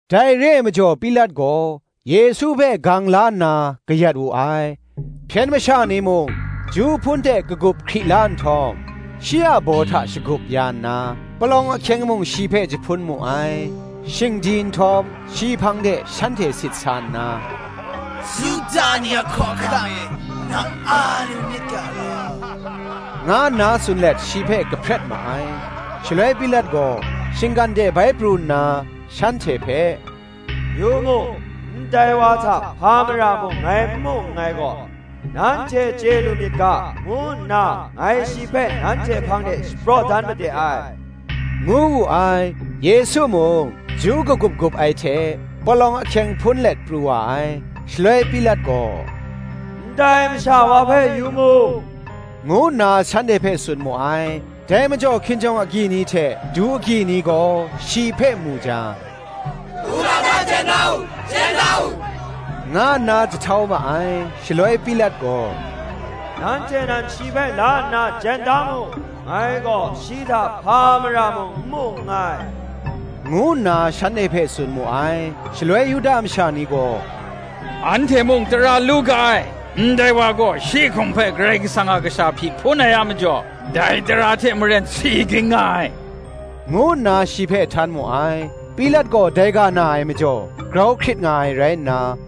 Dai re ai majaw Pilat gaw Yesu hpe gang la nna kayat wu ai. Hpyen masha ni mung ju hpun hte lagup hkri la nhtawm, shi a baw hta shagup ya nna, palawng ahkyeng mung shi hpe jahpun mu ai: shing di nhtawm, shi hpang de shanhte sit sa nna, “Yuda ni a Hkawhkam e, nang a lu nit ga law,” nga nna tsun let shi hpe kahpret ma ai. Shaloi Pilat gaw shinggan de bai pru nna, shanhte hpe, “Yu mu, ndai wa hta hpa mara mung ngai n mu nngai gaw, nanhte chye lu myit ga, ngu nna ngai shi hpe nanhte hpang de shapraw dan made ai,” ngu wu ai. Yesu mung, ju lagup gup ai hte palawng ahkyeng hpun let pru wa ai. Shaloi Pilat gaw, “Ndai masha wa hpe yu mu!” ngu nna shanhte hpe tsun mu ai. Dai majaw hkinjawng agyi ni hte du agyi ni gaw shi hpe mu jang, “Wudang hta jen da u, jen da u,” nga nna jahtau ma ai. Shaloi Pilat gaw, “Nanhte nan shi hpe la nna jen da mu; ngai gaw shi hta hpa mara mung n mu nngai,” ngu nna shanhte hpe tsun mu ai. Shaloi Yuda masha ni gaw, “Anhte mung tara lu ga ai; ndai wa gaw shi hkum hpe Karai Kasang a Kasha hpyi hpun ai a majaw, dai tara hte maren si ging nga ai,” ngu nna shi hpe htan mu ai. Pilat gaw dai ga na ai majaw grau hkrit nga ai rai nna,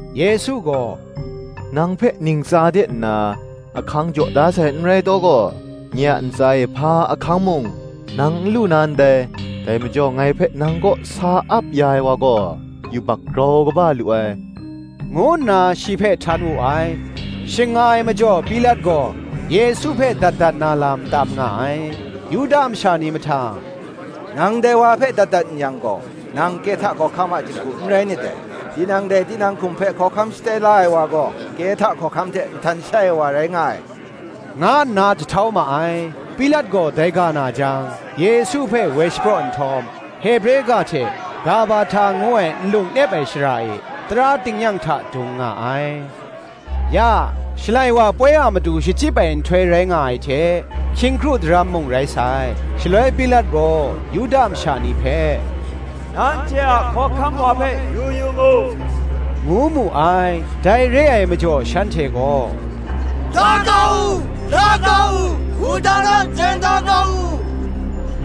Yesu gaw, “Nang hpe ntsa de nna, ahkang jaw da sai n rai taw gaw, nye a ntsa e hpa ahkang mung, nang n lu na ndai: dai majaw ngai hpe nang kaw sa ap ya ai wa gaw, yubak grau kaba lu ai,” ngu nna, shi hpe htan wu ai. Shing nga ai majaw Pilat gaw Yesu hpe dat dat na lam tam nga ai: Yuda masha ni mahtang, “Nang dai wa hpe dat dat n yang gaw, nang Kehta hkawhkam a jinghku n rai nit dai: tinang dai tinang hkum hpe hkawhkam shatai la ai wa gaw, Kehta hkawhkam hte nhtan shai ai wa rai nga ai,” nga nna jahtau ma ai. Pilat gaw dai ga na jang, Yesu hpe woi shapraw nhtawm, Hebre ga hte Gabahta ngu ai Nlung nep ai shara e tara tingnyang hta dung nga ai. Ya, Shalai wa ai poi a matu shachyip ai nhtoi rai nga ai hte, hkying kru daram mung rai sai. Shaloi Pilat gaw Yuda masha ni hpe, “Nanhte a hkawhkam wa hpe yu yu mu,” ngu mu ai. Dai re ai majaw shanhte gaw, “La kau u, la kau u, wudang hta jen da kau u!”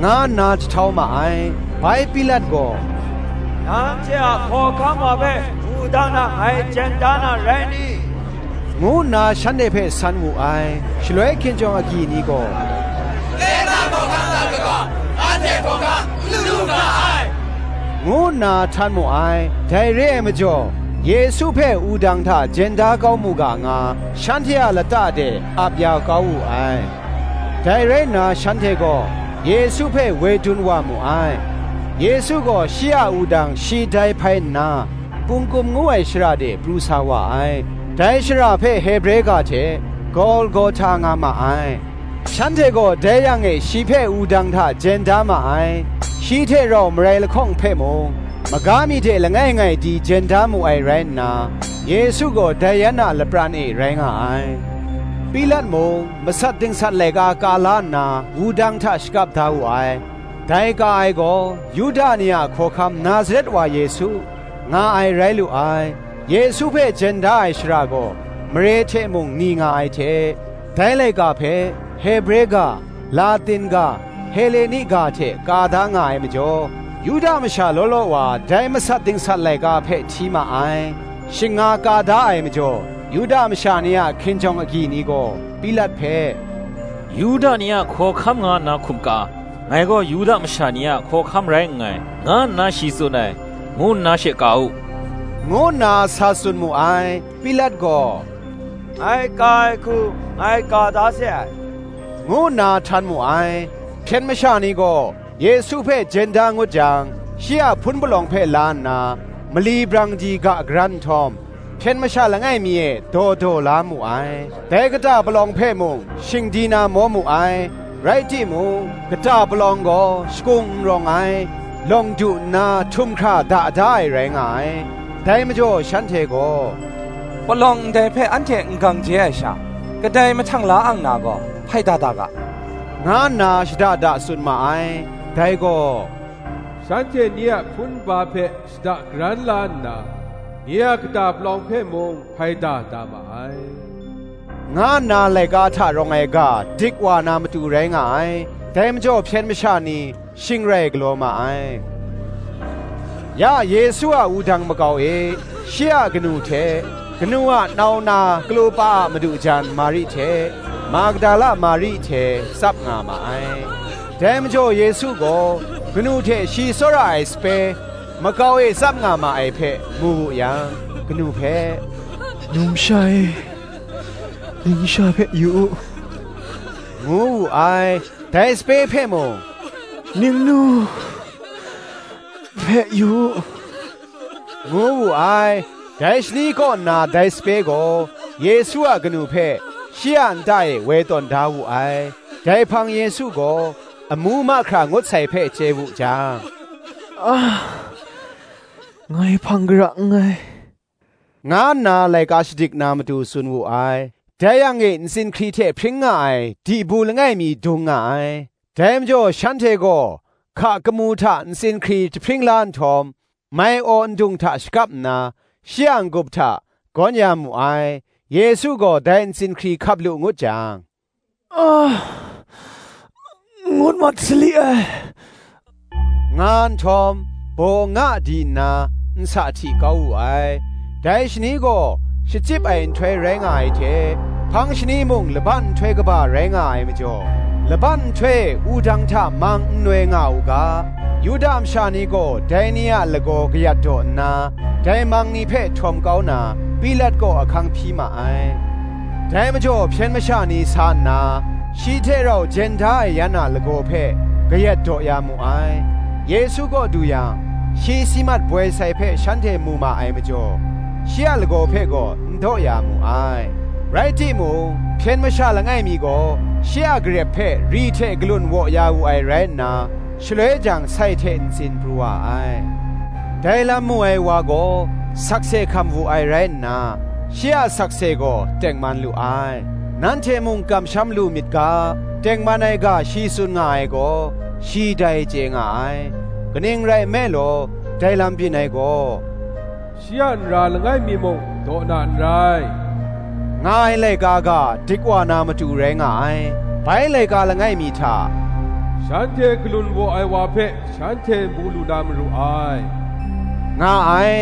nga nna jahtau ma ai. Bai Pilat gaw, “Nanhte a Hkawhkam wa hpe wudang hta ngai jen da na rai ni?” ngu nna shanhte hpe san wu ai. Shaloi hkinjawng agyi ni gaw, “Kehta hkawhkam hta kaga, anhte hkawhkam n lu ga ai,” ngu nna htan mu ai. Dai re ai majaw Yesu hpe wudang hta jen da kau mu ga nga, shanhte a lata de ap ya kau wu ai. Dai rai nna shanhte gaw Yesu hpe woi dun wa mu ai: Yesu gaw shi a wudang shi dai hpai nna, Pungkum ngu ai shara de pru sa wa ai; dai shara hpe Hebre ga hte Golgohta nga ma ai: shanhte gaw dai yang e shi hpe wudang hta jen da ma ai; shi hte rau marai lahkawng hpe mung, maga mi de langai ngai di jen da mu ai rai nna, Yesu gaw dai yan a lapran e rai nga ai. Pilat mung masat dingsat laika ka la nna wudang hta shakap da wu ai. Dai ka ai gaw, Yuda ni a Hkawhkam Nazaret wa Yesu, nga ai rai lu ai. Yesu hpe jen da ai shara gaw mare hte mung ni nga ai hte, dai laika hpe Hebre ga, Latin ga, Heleni ga hte ka da nga ai majaw, Yuda masha law law wa dai masat dingsat laika hpe hti ma ai. Shing nga ka da ai majaw, Yuda masha ni a hkinjawng agyi ni gaw, Pilat hpe, “Yuda ni a Hkawhkam nga nna hkum ka, Ngai gaw Yuda masha ni a Hkawhkam rai nngai, nga nna shi tsun ai, ngu nna she ka u,” ngu nna sa tsun mu ai. Pilat gaw, “Ngai ka ai hku ngai ka da se ai,” ngu nna htan mu ai. Hpyen masha ni gaw Yesu hpe jen da ngut jang, shi a hpun palawng hpe la nna, mali brang di ga karan nhtawm, hpyen masha langai mi e daw daw la mu ai: dai kata palawng hpe mung shing di na maw mu ai: rai timung, kata palawng gaw shakung n rawng ai, lawng du nna htum hkra da ai rai nga ai. Dai majaw shanhte gaw, “Palawng ndai hpe anhte n gang je ai sha, kadai mahtang la ang na gaw hpaida da ga,” nga nna shada da tsun ma ai; dai gaw, “Shanhte nye a hpun nba hpe shada karan la nna, Nye a kata palawng hpe mung hpaida da ma ai,” nga nna laika hta rawng ai ga dik wa na matu rai nga ai. Dai majaw hpyen masha ni shing rai galaw ma ai. Ya Yesu a wudang makau e shi a kanu hte, kanu a nau na Klopa a madu jan Mari hte, Magdala Mari hte tsap nga ma ai. Dai majaw Yesu gaw kanu hte shi tsawra ai sape, makau e tsap nga ma ai hpe, mu wu yang, kanu hpe, “Numsha e, ning sha hpe yu u,” ngu wu ai. Dai sape hpe mung, “Ning nu hpe yu u,” ngu wu ai. Dai shani kaw nna dai sape gaw, Yesu a kanu hpe shi a nta e woi tawn da wu ai. Dai hpang Yesu gaw amu mahkra ngut sai hpe chye wu jang, “Ngai hpang kara nngai,” nga nna laika shadik na matu tsun wu ai. Dai yang e ntsin hkri hte hpring nga ai dibu langai mi dung nga ai: dai majaw shanhte gaw hka kamu hta ntsin hkri jahpring la nhtawm, mai-aw ndung hta shakap nna, shi a n-gup hta gawn ya mu ai. Yesu gaw dai ntsin hkri hkap lu ngut jang, “Ngut masali ai,” nga nhtawm, baw nga di nna, nsa jahti kau wu ai. Dai shani gaw shachyip ai nhtoi rai nga ai hte, hpang shani mung Laban nhtoi kaba rai nga ai majaw, laban nhtoi e wudang hta mang n noi nga u ga, Yuda masha ni gaw dai ni a lagaw kayat daw nna, dai mang ni hpe htawm kau na, Pilat kaw ahkang hpyi ma ai. Dai majaw hpyen masha ni sa nna, shi hte rau jen da ai yan a lagaw hpe kayat daw ya mu ai: Yesu kaw du yang, shi si mat boi sai hpe shanhte mu ma ai majaw, shi a lagaw hpe gaw n daw ya mu ai: rai timung hpyen masha langai mi gaw, shi a garep hpe ri hte galun waw ya wu ai rai nna, shaloi jang sai hte ntsin pru wa ai. Dai lam mu ai wa gaw sakse hkam wu ai rai nna, shi a sakse gaw tengman lu ai: nanhte mung kamsham lu myit ga, tengman ai ga shi tsun nga ai gaw, shi dai chye nga ai. Kaning rai nme law, dai lam byin ai gaw, “Shi a nra langai mi muk daw na n rai,” nga ai laika ga dik wa na matu rai nga ai. Bai laika langai mi hta, “shanhte galun waw ai wa hpe shanhte mu lu na maru ai,” nga ai.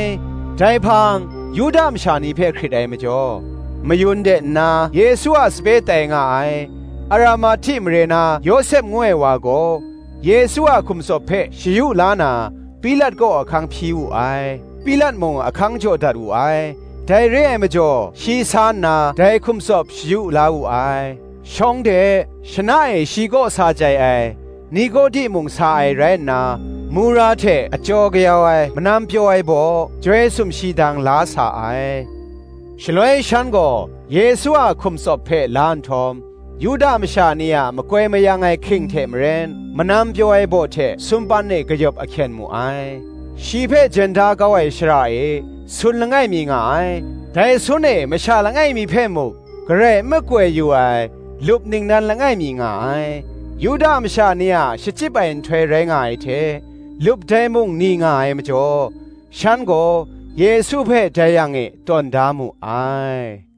Dai hpang, Yuda masha ni hpe hkrit ai majaw, mayun de nna Yesu a sape tai nga ai, Aramahti mare na Yawsep ngu ai wa gaw, Yesu a hkum tsawp hpe shayu la na, Pilat kaw ahkang hpyi wu ai; Pilat mung ahkang jaw dat wu ai: dai re ai majaw shi sa nna dai hkum tsawp shayu la wu ai. Shawng de shana e shi kaw sa chyai ai, Nikodi mung sa ai rai nna, mura hte achyaw kayau ai manam pyaw ai baw, joi sumshi dang la sa ai. Shaloi shan gaw Yesu a hkum tsawp hpe la nhtawm, Yuda masha ni a makoi mayang ai hking hte maren, manam pyaw ai baw hte sumpan e kayawp ahkyen mu ai. Shi hpe jen da kau ai shara e sun langai mi nga ai: dai sun e masha langai mi hpe muk garai n makoi yu ai lup ningnan langai mi nga ai. Yuda masha ni a shachyip ai nhtoi rai nga ai hte, lup dai mung ni nga ai majaw, shan gaw Yesu hpe dai yang e tawn da mu ai.